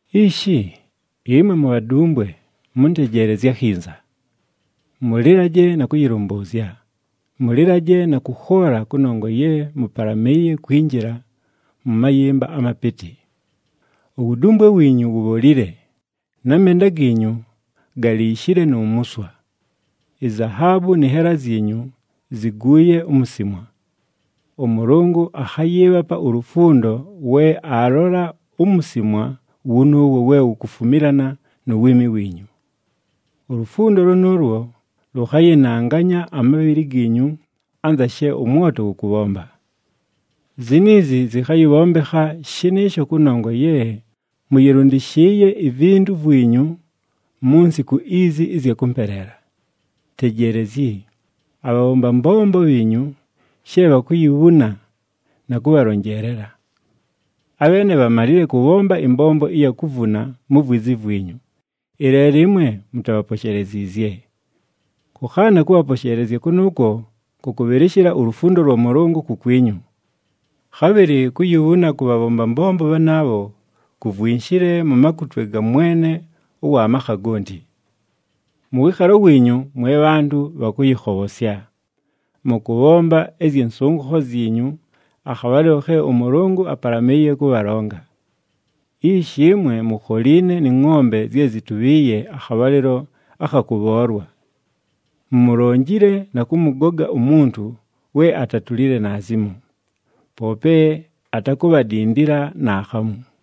Ishi, ɨmwe mubhadumbwe mʉntejeelezye akhinza! Mʉlɨlaje na kʉyɨlʉmbʉʉzya, mʉlɨlaje na kʉkhoola kʉnongwa ye mʉpalamɨɨye kwinjila mʉ mayɨmba amapɨtɨ. Uwudumbwe wiinyu wubholile, na menda giinyu galiishile nu muswa. Izahaabu nɨ nhela zyinyu ziguuye umusimwa. ɄMʉlʉngʉ akhayɨɨbhapa ulufundo we aalola umusimwa wʉnʉʉwo we wukufumilana nu wiimi wiinyu. Ulufundo lʉnʉʉlwo lʉkhayɨnanganya amabhɨlɨ giinyu anza she ʉmwoto wʉkʉbhomba. Ziniizi zɨkhayɨbhombekha shɨnɨɨsho kʉnongwa ye mʉyɨlʉndɨshɨɨye ivintu vwinyu mu nsiku izi ɨzya kʉmpeleela. Tejeelezyi, abhabhomba mbombo bhiinyu she bhakuyibhuna na kʉbhalonjeelela! Abheene bhamalile kʉbhomba ɨmbombo ɨya kuvuna mu vwizi vwinyu, ɨleelo ɨmwe mutabhaposheleziizye. Kʉkhaana kʉbhaposheelezya kʉnʉʉkwo kʉkʉbhɨlɨshɨla ulufundo lwa Mʉlʉngʉ kukwinyu. Khabhɨlɨ kuyibhuna kʉ bhabhomba mbombo bhanaabho kuvwinshile mu makutwe ga Mwene ʉwa makha gonti. Mʉ wɨɨkhalo wiinyu, mwe bhantʉ bha kʉyɨkhobhosya. Mʉkʉbhomba ɨzyɨ nsʉngʉkho zyinyu, akhabhalɨlo khe ʉMʉlʉngʉ apalamɨɨye kʉbhalonga. Ishi ɨmwe mukholiine nɨ ngʼombe zye zitubhiiye akhabhalɨlo akha kʉbhoolwa. Mumulonjile na kʉmʉgoga umuntu we atatulile naazimo, poope atakubhadindila naakhamu.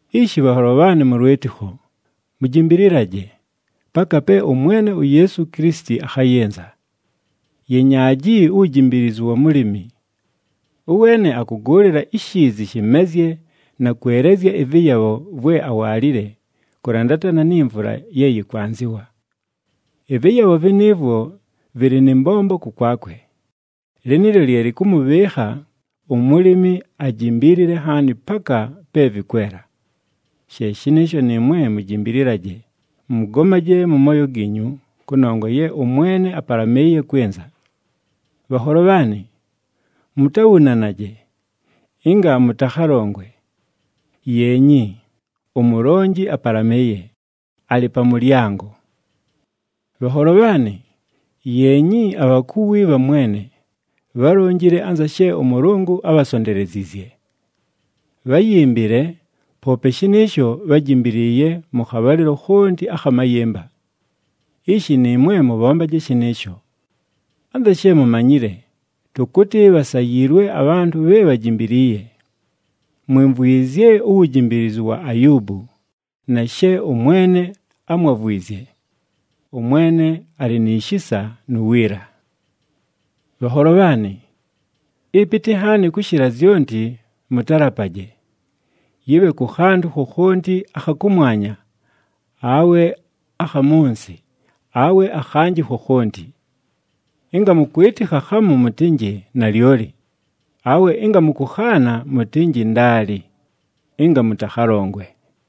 Ishi bhanholo bhaanɨ mʉ lwɨtɨkho, mujimbililaje, paka pe ʉMwene uYeesu Kilisiti akhayɨnza. Yenyaaji uwujimbiilizu wa mulimi. Ʉweene akʉgʉʉlɨla ishiizi shɨmezye na kwelezya ɨvɨyabho vwe awaalile kʉlandatana ni mvula ye yɨkwanzɨwa. Ɨvɨyabho vɨnɨɨvwo vɨlɨ nɨ mbombo kʉkwakwe. Lɨnɨɨlyo lye lɨkʉmʉbhɨɨkha umulimi ajimbiilile nhaani, paka pe vɨkwela. She shɨnɨɨsho nɨɨmwe mujimbililaje, mʉgomaje mʉ mooyo giinyu, kʉnongwa ye ʉMwene apalamɨɨye kwɨnza. Bhanholo bhaanɨ, mutabhunanaje, ɨnga mʉtakhalongwe. Yeenyi! UMulonji apalamɨɨye, alɨ pa mʉlyango! Bhanholo bhaanɨ, yeenyi abhakuwi bha Mwene, bhálonjile anza she ʉMʉlʉngʉ ábhasonteleziizye. Bháyimbile, poope shɨnɨɨsho bhájimbiliiye mʉ khabhalɨlo khonti akha mayɨmba. Ishi nɨɨmwe mʉbhombaje shɨnɨɨsho. Anza she mumanyile, tʉkʉtɨ bhasayiilwe abhantʉ bhe bhajimbiliiye. Mwimvwizye uwujimbiilizu wa Ayuubu, na she ʉMwene ámwavwizye. ɄMwene alɨ ni shisa nu wiila. Bhanholo bhaanɨ, ɨpɨtɨ nhaani kʉshɨla zyonti, mʉtalapaje, yɨbhe kʉ khantʉ khokhonti akha kʉmwanya, awe akha mʉ nsɨ, awe akhanjɨ khokhonti. Ɨnga mʉkwɨtɨkha khamu mʉtɨnjɨ, “Nalyoli,” awe ɨnga mʉkʉkhaana mʉtɨnjɨ, “Ndaali,” ɨnga mʉtakhalongwe.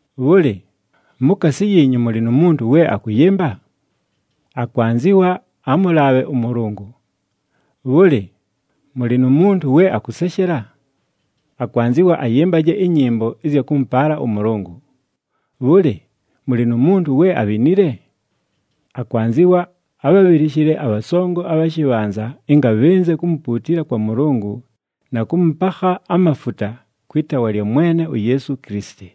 Bhʉlɨ, mukaasi yiinyu mʉlɨ nu muntu we akʉyɨmba? Akwanzɨwa amʉlaabhe ʉMʉlʉngʉ. Bhʉlɨ, mʉlɨ nu muntu we akʉseshela? Akwanzɨwa ayɨmbaje ɨnyɨmbo ɨzya kʉmʉpaala ʉMʉlʉngʉ. Bhʉlɨ, mʉlɨ nu muntu we abhinile? Akwanzɨwa abhabhɨlɨshɨle abhasongo abha shɨbhanza ɨnga bhɨnze kumupuutila kwa Mʉlʉngʉ na kʉmʉpakha amafuta kwɨ taawa lya Mwene uYeesu Kilisiti.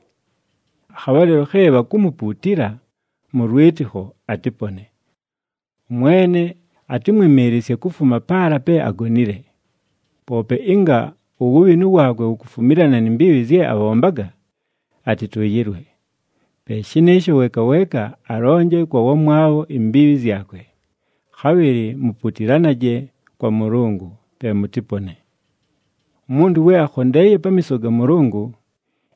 Akhabhalɨlo khe bhakumupuutila mʉ lwɨtɨkho, atɨpone. ɄMwene atɨmwɨmɨɨlɨsye kufuma paala pe agonile. Poope ɨnga uwubhinu waakwe wukufumilana ni mbiibhi zye abhombaga, atɨtʉʉyɨlwe. Pe shɨnɨɨsho, weeka weeka alonje kwa wamwabho imbiibhi zyakwe, khabhɨlɨ muputilanaje kwa Mʉlʉngʉ, pe mʉtɨpone. Umuntu we akhondeeye pamiiso ga Mʉlʉngʉ,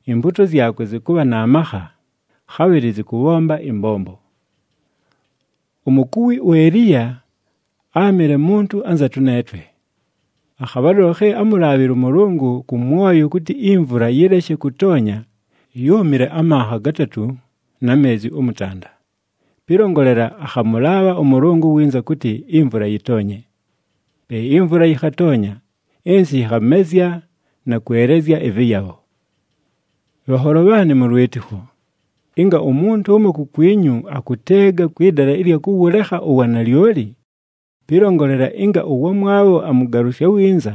impuuto zyakwe zɨkʉbha na makha, khabhɨlɨ zɨkʉbhomba ɨmbombo. Umukuwi uEliya áamɨle muntu anza tʉneetwe. Akhabhalɨlo khe ámulaabhile ʉMʉlʉngʉ kʉ mwoyo kʉtɨ imvula yɨleshe kʉtoonya, yúumile amanha gatatʉ na meezi ʉmʉtanda. Pɨlongolela, akhamʉlaabha ʉMʉlʉngʉ winza kʉtɨ imvula yɨtoonye. Pe imvula yɨkhatoonya, ɨnsɨ yɨkhamezya na kwelezya ɨvɨyabho. Bhanholo bhaanɨ mʉ lwɨtɨkho, ɨnga umuntu ʉmo kukwinyu akʉteega kwɨ dala ɨlya kʉwʉlekha uwanalyoli, pɨlongolela ɨnga ʉwamwabho amʉgalʉsya winza,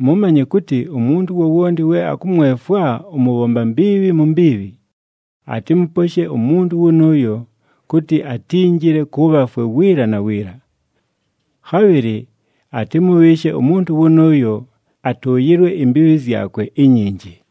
mʉmanye kʉtɨ, umuntu wowonti we akʉmwefwa ʉmʉbhomba mbiibhi mu mbiibhi, atɨmʉposhe umuntu wʉnʉʉyo kʉtɨ atinjile kʉ bhafwe wiila na wiila. Khabhɨlɨ atɨmʉbhɨɨshe umuntu wʉnʉʉyo atʉʉyɨlwe imbiibhi zyakwe inyinji.